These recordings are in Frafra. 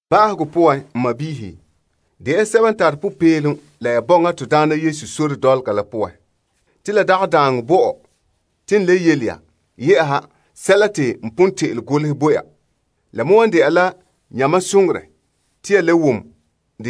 Ba'ahegɔ poan, n sɔɔnrɔ de ya sɛba n tare popeelom la ya bɔŋa Na'ayenɛ sore dɔlɔga la poan. Te la dagɛ daaŋɔ bo mam te n le yele ya yɛ'ɛha sɛla te n pon te'ele golehɛ bo ya. La me wan dɛna la yamam soŋorɛ te ya le wom de.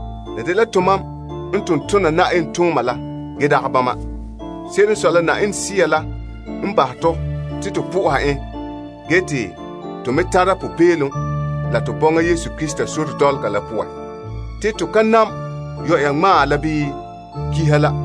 La dela tomam n ton tona Yenɛ tooma la ge dagɛ bama. Se'ere n sɔe la, Yenɛ Sea la n bahɛ tɔ te to po'oha en ge me tara popeelom la to bɔŋa Krista Yesu sore dɔlɔga la poan. Te to ka nam yɔ'ɔra ŋmaa la bii kiha la.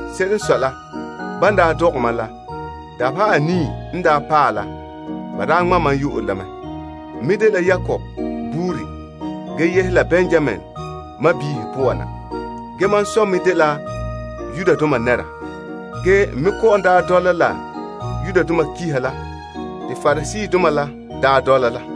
Se'ere n sɔe la, ban daa dɔgɛ mam la dabeha anii n daa paɛ la ba daa ŋma' mam. N me dela Israel buuri, yehe Benyaminbiihe poan na. Mam dela Hebru ziim. Ge n me dɔla la pa'alegɔ la te Pariseedoma dɔla la.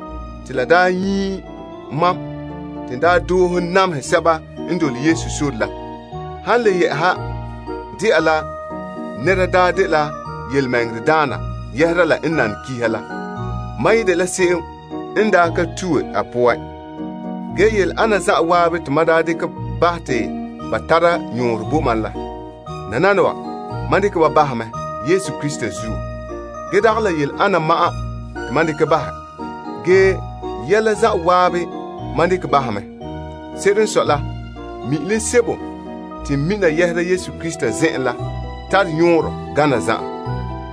La daa nyie mam te n daa doohe namehɛ sɛba n dole Yesu sore la. Han le dɛna la nɛra n nane pa'alegɔ la, mam ye dela se'em n daa ka tue a poan. Ge yele ana zan'an te mam daa dekɛ te ba tare yɔɔrɛ bo mam la. Nananawa, mam dekɛ ba bahɛ mɛ Krista zuo. Ge dagɛ la yele ana ma'an te mam dekɛ bahɛ, ge yɛla zan'an mam dekɛ bahɛ mɛ. Se'ere n sɔe la, mi'ilom sebo te n mina yɛhera n Na'ayenɛ Krista Yesu zen'en la tare yɔɔrɛ gana zan'an.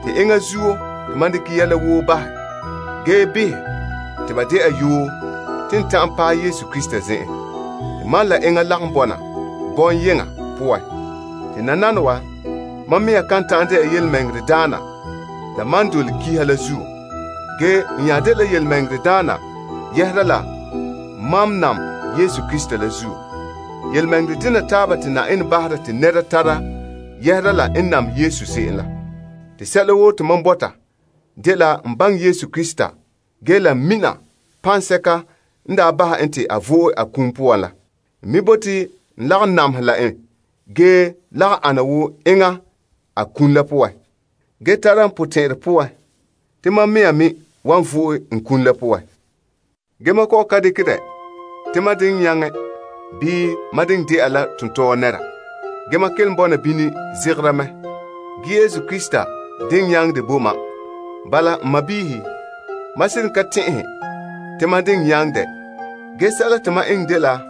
Te enŋa zuo te mam dekɛ yɛla woo bahɛ ge behɛ te ba dɛna yoo te n ta'an paɛ Krista zen'en, te mam la enŋa lagom bɔna bɔŋyeŋɔ poan. Te nananawa, mam mɛŋa kan ta'an dɛna tontɔɔdaana la mam te n dole pa'alegɔ la zuo. Ge n nya dela tontɔɔdaana yɛhera la mam nam Krista la zuo. Tontɔɔ dena taaba te Yenɛ bahera te nɛra tara yɛhera la n nam Yesu se'em la. Te sɛla woo te mam bɔta dela n baŋɛ Krista ge la n mina paŋsɛka n daa bahɛ en te a vo'e a kum poan la. N me bote n lagom namehɛ la en, ge lagom ana wo enŋa a kum la poan, ge tara n potɛn'ɛrɛ poan te mam mɛŋa me wan vo'e n kum la poan. Ge mam kɔ'ɔn ka dekɛ dɛ te mam diŋ nyaŋɛ bii mam diŋ dɛna la tontɔɔ nɛra. Ge mam kelom bɔna bini zegera mɛ te n paɛ yɔɔrɛ se'ere te Krista Yesu pon nyaŋɛ dɛ bo mam la. Bala, n sɔɔnrɔ, mam seren ka tɛn'ɛhɛ te mam diŋ nyaŋ di' dɛ. Ge sɛla te ma eŋɛ dela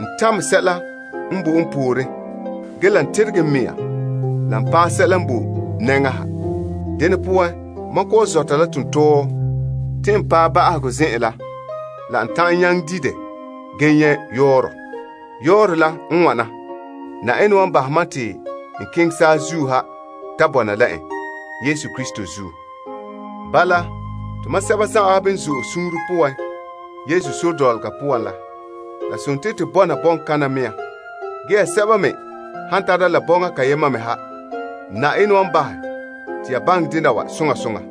n tamɛ sɛla n boe n pooren ge la n teregɛ n mɛŋa la n paa sɛla n boe n nɛŋa ha. Dene poan, mam kɔ'ɔn zɔta la tontɔɔ te n paɛ ba'ahegɔ zen'an la la n ta'an nyaŋɛ di dɛ ge nyɛ' yɔɔrɛ. Yɔɔrɛ la n wana: Yenɛ wan bahɛ mam te n keŋɛ saazuo ha ta bɔna la en, Krista Yesu zuo. Bala, tomam sɛba zan'an n zo'e suunre poan Yesu sore dɔlɔga poan la, la dela to bɔna bɔŋkaŋa mea. Ge ya sɛba me han tara la potɛn'ɛrɛ deyema, Yenɛ wan bahɛ te ya baŋɛ dɛna wa soŋa soŋa.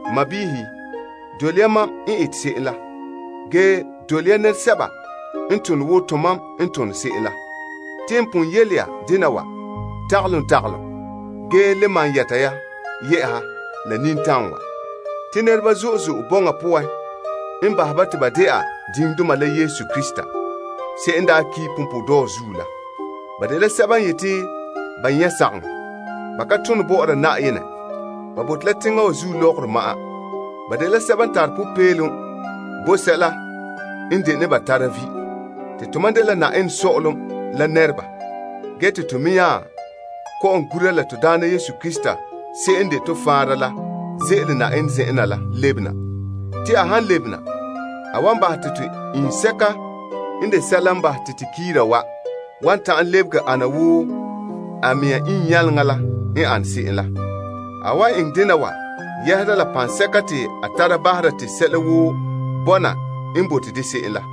N sɔɔnrɔ, dole ya mam n ete se'em la, ge dole ya nɛresɛba n tone wo tomam n tone se'em la. Te n pon yele ya dena wa tagalom ge le malom yɛta ya la nintam wa. Te nɛreba zo'e zo'e bɔŋa poan n bahɛ ba te ba dɛna diŋdoma la Krista, se'em n daa ki' punpuuredɔɔ zuo la. Ba dela sɛba n yeti ba nyɛ' sagaŋɔ. Ba ka tone bɔ'ɔra Na'ayenɛ. Ba bote la teŋa wa zuo lɔgɔrɔ ma'an. Ba dela sɛba n tare popeelom bo sɛla n dene ba tara vi'. Te tomam dela Yenɛ Sɔ'ɔlom la nɛreba ge te to me nya kɔ'ɔn gura la Na'ayenɛ Yesu Krista se'em n de to Faanra la ze'ele Yenɛ zen'en la lebena. Te a han lebena, a wan bahɛ te to iŋsɛka n de sɛla n bahɛ te to kiira wan ta'an lebege ana wo a mɛŋa iŋnyaleŋa la n ane se'em la. A wan eŋɛ dena wa yɛhera la paŋsɛka te a tara bahera te sɛla woo bɔna n bote de se'em la.